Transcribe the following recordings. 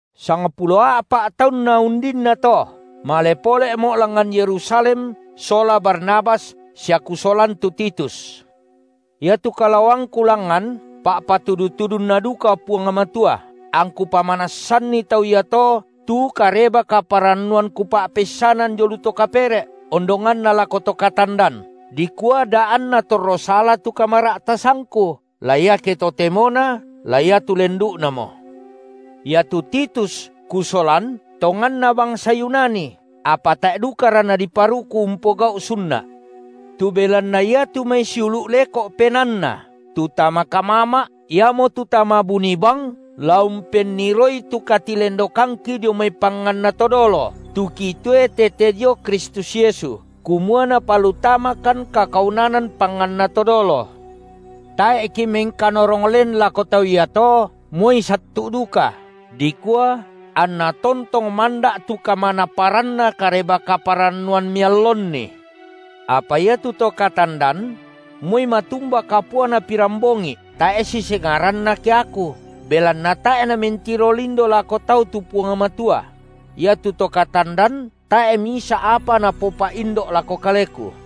Sangpulo a’pa’ taunna undinnato, male pole’mo’ langngan Yerusalem sola Barnabas sia kusolan tu Titus. Iatu kalaoangku langngan, pa’patudu-tudunNa duka Puang Matua, angku pamanassanni tau iato tu Kareba-kaparannuan kupa’peissanan dio lu to kapere’, ondonganna lako to katandan, dikua da anna torro sala tu kamara’tasangku, la iate totemona la iatu lendu’namo. Iatu Titus kusolan, tonganna bangsa Yunani, apa tae’ dukara nadiparuku umpogau’ sunna’. Tu belanna iatu mai siulu’ leko’ penaanna, tu tama kamama’, iamotu tama buni bang la umpenniroi tu katilendokangki dio mai panganna to dolo, tu kitoe tete dio Kristus Yesu, kumua napalutamakan kakaunanan panganna to dolo. Tae’ kimengkanorong len lako tau iato moi sattu’ duka, dikua anna tontong manda’ tu kamanapparanna Kareba-kaparannuan miallonni. Apa iatu to katandan – moi matumba kapuana pirambongi’ tae’ sisengaranna keaku, belanna tae’ Namentiro lindo lako tau tu Puang Matua – iatu to katandan tae’ misa’ apa napopa’indo’ lako kaleku.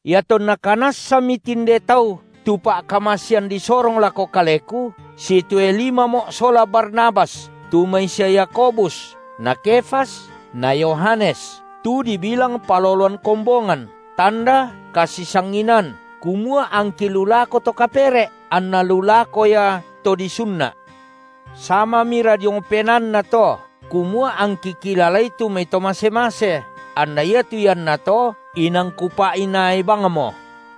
iatonna kanassami tinde tau tu pa’kamasean disorong lako kaleku, sitoe limamo’ sola Barnabas tu mai sia Yakobus na Kefas na Yohanes, tu dibilang paloloan kombongan, tanda kasisanginaan, kumua angki lu lako to kapere’, anna lu lako ia to disunna’. Samamira diong penaanna to kumua angki kilalai tu mai to mase-mase, anna iatu iannato inang kupa’inaai bangmo.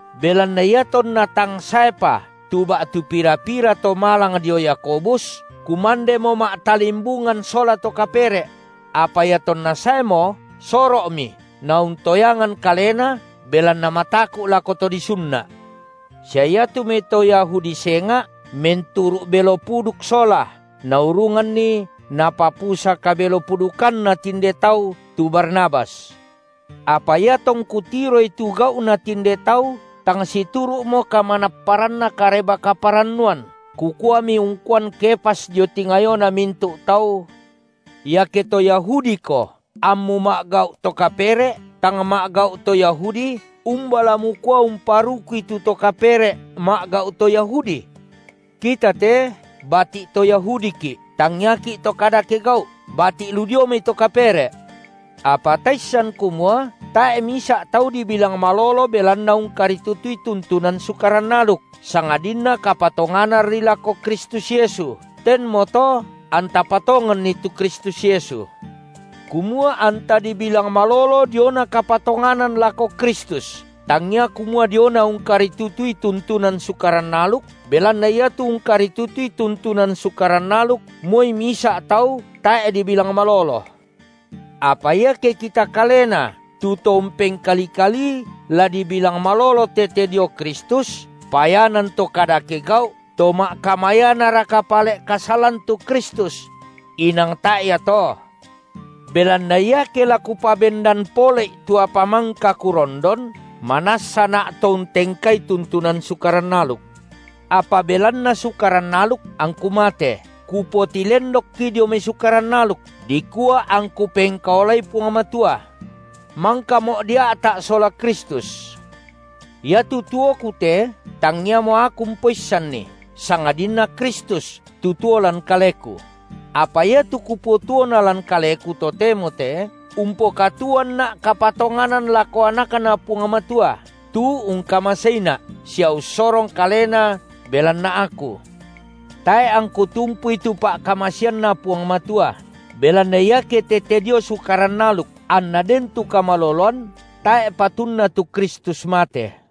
Belanna iatonna tang saepa tu ba’tu pira-pira to malang dio Yakobus, kumandemo ma’talimbungan sola to kapere’; apa iatonna saemo, soro’mi, nauntoyangan kalena, belanna mataku’ lako to disunna’. Sia iatu mai to Yahudi senga’ menturu’ belo puduk sola, naurunganni napapusa kabelo-pudukanna tinde tau tu Barnabas. Apa iatongku tiroi tu gau’na tinde tau tang situru’mo kamanapparanna Kareba-kaparannuan, kukuami ungkuan Kefas dio tingayona mintu’ tau: Iake to Yahudiko, ammu ma’gau’ to kapere’, tang ma’gau’ to Yahudi, umba la mukua umparukui tu to kapere’ ma’gau’ to Yahudi? Kita te bati’ to Yahudiki’, tangiaki’ to kadake gau’, bati’ lu dio mai to kapere’, apa taissan kumua tae’ misa’ tau dibilang malolo belanna ungkaritutui tuntunan Sukaran aluk, sangadinna kapatongananri lako Kristus Yesu, tenmoto anta patonganni tu Kristus Yesu, kumua anta dibilang malolo diona kapatonganan lako Kristus, tangia kumua diona ungkaritutui tuntunan Sukaran aluk, belanna iatu ungkaritutui tuntunan Sukaran aluk, moi misa’ tau tae’ dibilang malolo. Apa iake kita kalena tu to umpengkali-kalii la dibilang malolo tete dio Kristus, payanan to kadake gau’, to ma’kamayanaraka pale’ kasalan tu Kristus? Inang tae’ ia to! Belanna iake la kupabendan pole’i tu apa mangka kurondon, manassana’ to untengkai tuntunan Sukaran aluk. Apa belanna Sukaran aluk angku mate, kupotilendokki dio mai Sukaran aluk, dikua angku pengkaolai Puang Matua. Mangkamo’ dia’ta’ sola Kristus. Iatu tuoku te tangiamo aku umpoissanni, sangadinna Kristus tu tuo lan kaleku; apa iatu kupotuona lan kaleku totemo te, umpokatuoanna’ kapatonganan lako AnakNa Puang Matua, tu ungkamaseina’, sia ussorong Kalena belanna aku. Tae’ angku tumpui tu pa’kamaseanNa Puang Matua, belanna iake tete dio Sukaran aluk anna den tu kamaloloan, tae’ patunna tu Kristus mate.